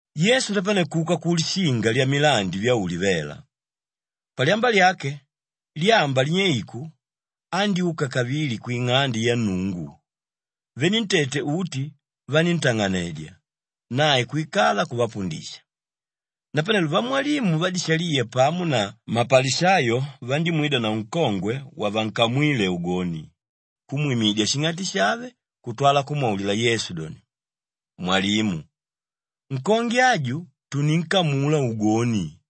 Yesu napane kuka ku Lishinga lya Milandi vya Ulivela. Palyamba lyake, lyamba linyeiku andyúka kavili kwing'ande ya Nnungu. Venentete uti vaníntang'anedya, nae kwikala kuvapundisha. Napanelo vamwalimu vadishaliya pamo na mapalishayo vandímwidanavo nkongwe wavankamwíle ugoni kumwimidya shing'ati shave kutwala kumwaulila Yesu doni, “Mwalimu, nkongwe aju tuninkamula ugoni.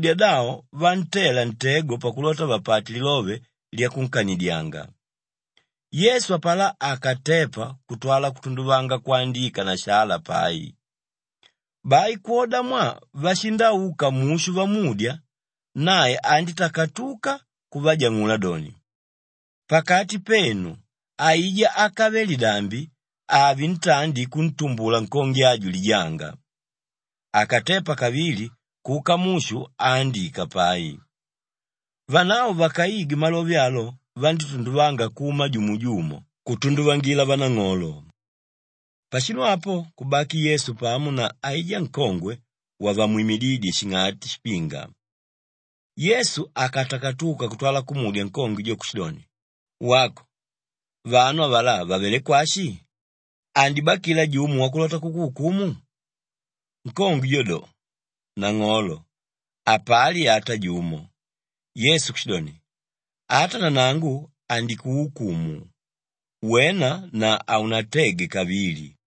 Vandímudya davo vantela ntego pakulota vapate lilove lyakunkanidyanga. Yesu apalá akatepa kutwala kutunduvanga kwandika na shala pai. Bai kwodamwaa vashindauka mushu vamudya, nae andítakatuka kuvajang'ula doni, “Pakati penu, aijá ákave lidambi ave ntandi kuntumbula nkongwe aju lijanga.” Akatepa kavili kuka mushu aandika pai. Vanavo vakaigwe malove alo vandítunduvanga kuma jumo jumo kutunduvangila vanang'olo. Pashinu apo kubaki Yesu pamo na aijá nkongwe wavamwimidídye shing'ati shipinga. Yesu akatakatuka kutwala kumudya nkongwe jo kushidoni, “Wako, vanu avalá vavelé kwashi? Andibakila jumo wakulota kukuukumu?” Nkongwe jo do, “Nang'olo, hapali ata jumo.” Yesu kushidoni, “Ata nanangu handikuukumu. Wena na haunatege kavili.”]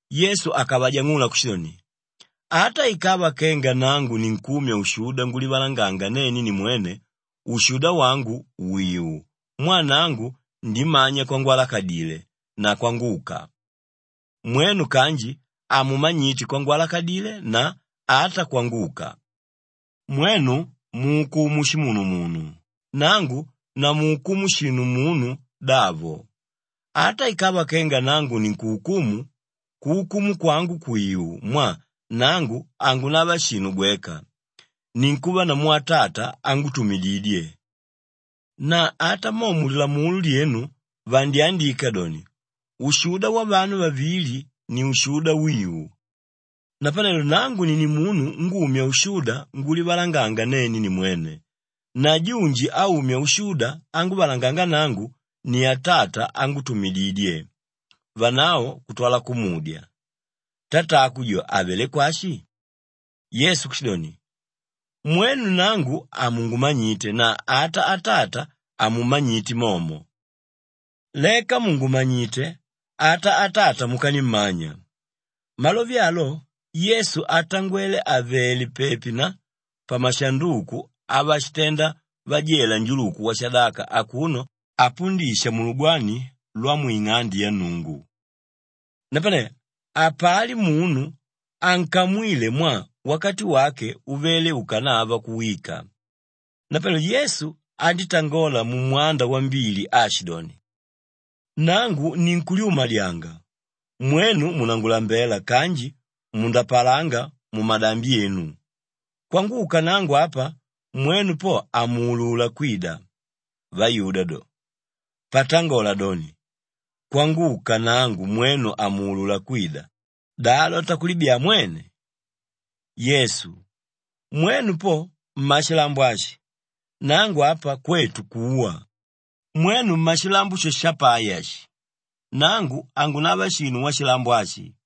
Yesu akavajang'ula kushidoni, “Ata ikava kenga nangu ninkumya ushuda ngulivalanganga nene nimwene ushuda wangu wìu mwaa nangu ndimanya kwangwalakadile na kwanguka. Mwenu kanji hamumanyite kwangalakadile na ata kwanguka. Mwenu muukumu shimunumunu, nangu namuukumu shinu munu davo. Ata ikava kenga nangu ninkuukumu, kuukumu kwangu kwìu mwaa nangu hangunava shinu gweka, ninkuva namu Atata ángutumididye. Na ata mo mu Lilamulo lyenu vandyandika doni, ushuda wavanu vavili ni ushuda wiu. Napanelo nangu ni nimunu ngumya ushuda ngulivalanganga nene nimwene na junji áumya ushuda anguvalanganga nangu ni Atata ángutumididye.” Vanavo kutwala kumudya, “Tatako jo avelé kwashi?” Yesu kushidoni, “Mwenu nangu hamungumanyite na ata Atata hamummanyite momo. Leka mùngumanyite ata Atata mukanimmanya.” Malove alo Yesu atangwele àvele pepi na pamashanduku avashitenda vajela njuluku washadaka akuno apundisha mulugwani lwamwing'ande ya Nnungu. Napane hapali munu ankamwíle mwaa wakati wake uvele ukanava kuwika. Napanelo Yesu andítangola mumwanda wambili aashidoni, “Nangu ninkulyumadyanga, mwenu munangulambela kanji mundapalanga mumadambi enu. Kwanguka nangu apa mwenu po hamuulula kwida.” Vayuda do, “Patangola doni, ‘Kwanguka nangu mwenu hamuulula kwida,’ da alota kulibyaa mwene?” Yesu, “Mwenu po mmashilambo ashi, nangu apa kwetu kuwa. Mwenu mmashilambo sho shapai ashi, nangu hangunava shinu washilambo ashi.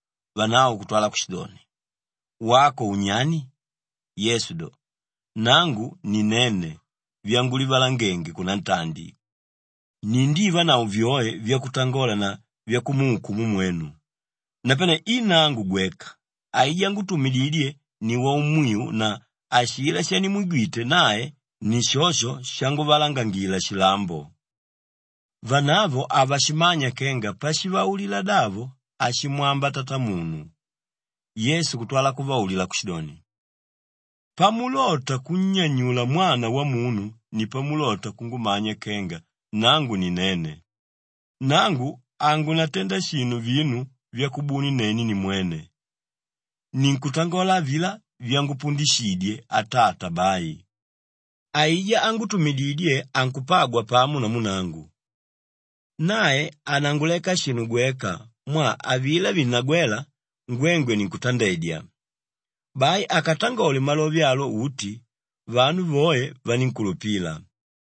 Vanavo kutwala kushidoni, “Wako unyani?” Yesu do, “Nangu ni Nene vyangulivalangenge kunantandi. Nindivanavo vyoe vyakutangola na vyakumuukumu mwenu; napane i nangu gweka, aijá ángutumididye ni waumwiu na ashilá shanimwigwite nae ni shosho shanguvalangangila shilambo.” Vanavo havashimanya kenga pashivaulila davo ashimwamba Tatamunu. Yesu kutwala kuvaulila kushidoni, “Pamulota kunnyanyula Mwana Wamunu ni pamulota kungumanya kenga Nangu ni Nene. Nangu hangunatenda shinu vinu vyakubuni nene nimwene; ninkutangola avilá vyangupundishidye Atata bai. Aijá ángutumididye ankupagwa pamo namu nangu. Nae hananguleka shinu gweka mwaa avilá vinnagwéla, ngwengwe ninkutandedya.” Bai akatangole malove alo uti, vanu voe vanínkulupila.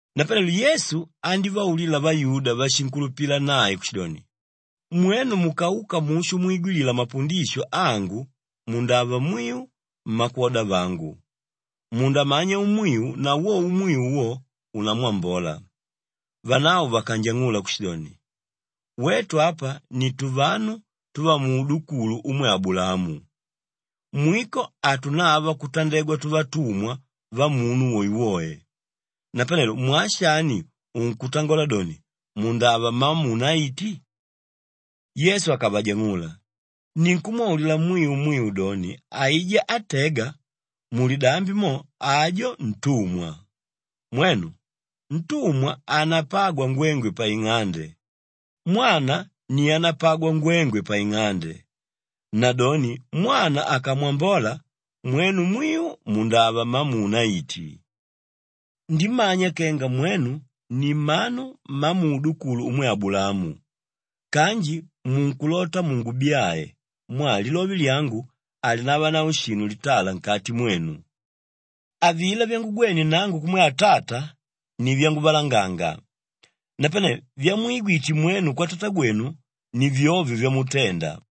Napanelo Yesu andívaulila vayuda váshinkulupila nae kushidoni, “Mwenu mukauka mushu mwigwilila mapundisho angu mundava mwiu mmakwoda vangu. Mundamanya umwiu na wo umwiu wo, unamwambola.” Vanavo vakanjang'ula kushidoni, “Wetu apa ni tuvanu tuvamuudukulu umwe Abulaamu. Mwiko hatunava kutandegwa tuvatumwa vamunu woewoe. Napanelo mwaa shani unkutangola doni, ‘Mundava mmamuunaiti’?” Yesu akavajang'ula, “Ninkumwaulila mwiu mwiu doni, aijá átega, mulidambi mo, ajo ntumwa. Mwenu! Ntumwa hanapagwa ngwengwe paing'ande; mwana ni ánapagwa ngwengwe paing'ande. Nadoni Mwana akamwambola, mwenu mwiu mundava mmamuunaiti. Ndimanya kenga mwenu ni mmanu mmamuudukulu umwe Abulaamu kanji munkulota mungubyae mwaa lilove lyangu halinavanavo shinu litala nkati mwenu. Avilá vyangugwene nangu kumwe Atata ni vyanguvalanganga; napane vyamwigwite mwenu kwatatagwenu, ni vyovyo vyamutenda.”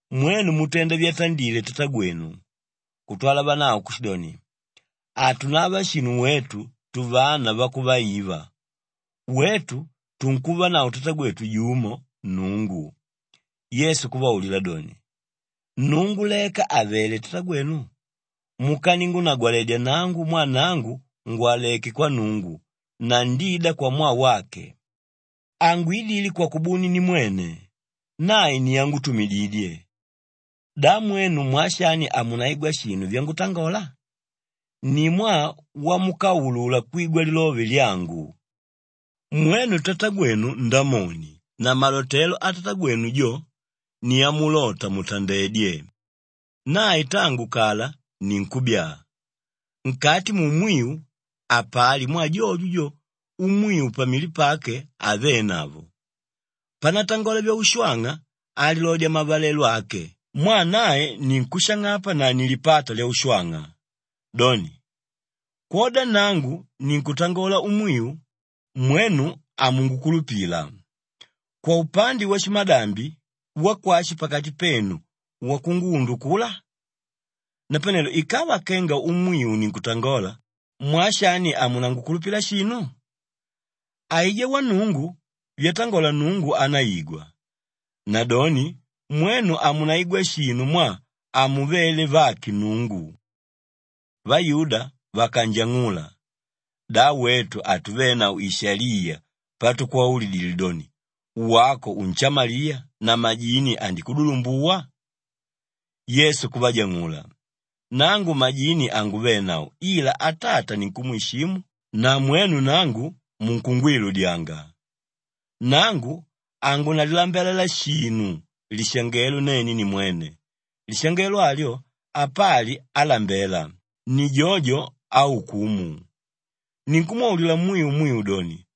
Mwenu mutenda vyatandile tatagwenu.” Kutwala vanavo kushidoni, “Hatunava shinu wetu tuvana vakuvaiva. Wetu tunkuvanavo Tatagwetu jumo, Nnungu.” Yesu kuvaulila doni, “Nnungu leka àvele tatagwenu mukaningunagwaledya nangu mwaa nangu ngwaleké kwa Nnungu na ndida kwamwaa wake. Hangwidile kwakubuni nimwene, nae ni ángutumididye. Da mwenu mwaa shani hamunaigwa shinu vyangutangola? Ni mwaa wamukaulula kwigwa lilove lyangu. Mwenu tatagwenu Ndamoni na malotelo atatagwenu jo, ni amulota mutandedye. Nae tangu kala ni nkúbyaa, nkati muumwiu, hapali mwaa jojo jo umwiu pamili pake havenavo. Panatangola vyaushwang'a alilodya mavalelo ake mwaa nae ni nkúshang'apa na ni lipata lyaushwang'a. Doni, kwoda nangu ninkutangola umwiu, mwenu hamungukulupila. Kwaupande washimadambi, wakwashi pakati penu wakunguundukula? Napanelo ikava nangu umwiu ninkutangola, mwaa shani hamunangukulupila shinu? Aijá wa Nnungu, vyatangola Nnungu anáigwa. Nadoni mwenu hamunaigwa shinu mwaa hamuvele vake Nnungu.” Vayuda vakanjang'ula, “Da wetu hatuvenavo ishaliya patukwaulidile doni, ‘Wako unshamaliya na majini andikudulumbuwa’?” Yesu kuvajang'ula, “Nangu majini hanguvenavo ila Atata ninkumwishimu na mwenu nangu, munkungwiludyanga. Nangu hangunalilambalela shinu lishangelo nene nimwene. Lishangelo alyo, apali álambela; ni jojo áukumu. Ninkumwaulila mwiu mwiu doni,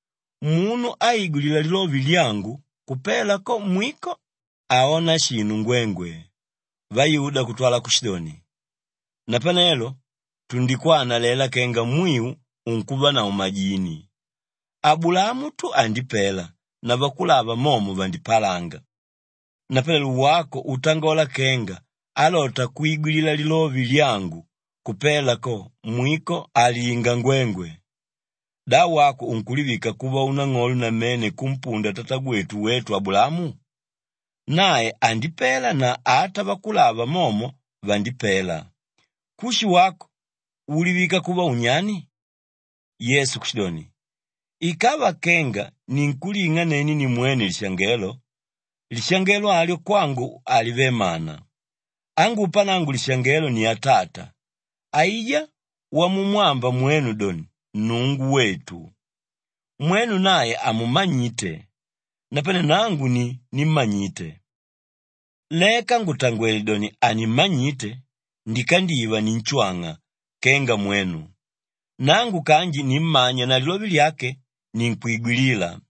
munu áigwilila lilove lyangu, kupela ko mwiko, haona shinu ngwengwe.” Vayuda kutwala kushidoni, “Napanelo tundikwanalela kenga mwiu unkuvanavo majini. Abulaamu tu andipela na vakulava momo vandipalanga. Napanelo wako utangola kenga álota kwigwilila lilove lyangu, kupela ko mwiko, halinga ngwengwe! Da wako unkulivika kuva unang'olo namene kumpunda tatagwetu wetu Abulaamu? Nae andipela na ata vakulava momo vandipela. Kushi wako, ulivika kuva unyani?” Yesu kushidoni, “Ikava kenga ninkuling'a nene nimwene lishangelo, lishangelo alyo kwangu halive mana. Ángupa nangu lishangelo ni Atata, aijá wamumwamba mwenu doni, ‘Nnungu wetu.’ Mwenu nae hamummanyite, napane nangu ni nímmanyite. Leka ngùtangwele doni hanimmanyite, ndikandiva ninshwang'a kenga mwenu. Nangu kanji nimmanya na lilove lyake, ninkwigwilila.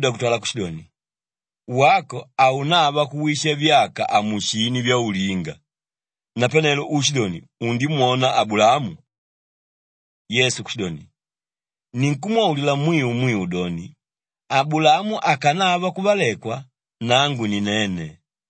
Vayuda kutwala kushidoni, “Wako haunava kuwisha vyaka amusini vyaulinga. Napanelo uushidoni undimwona Abulaamu?” Yesu kushidoni, “Ninkumwaulila mwiu mwiu doni, Abulaamu akanava kuvalekwa, Nangu ni Nene.”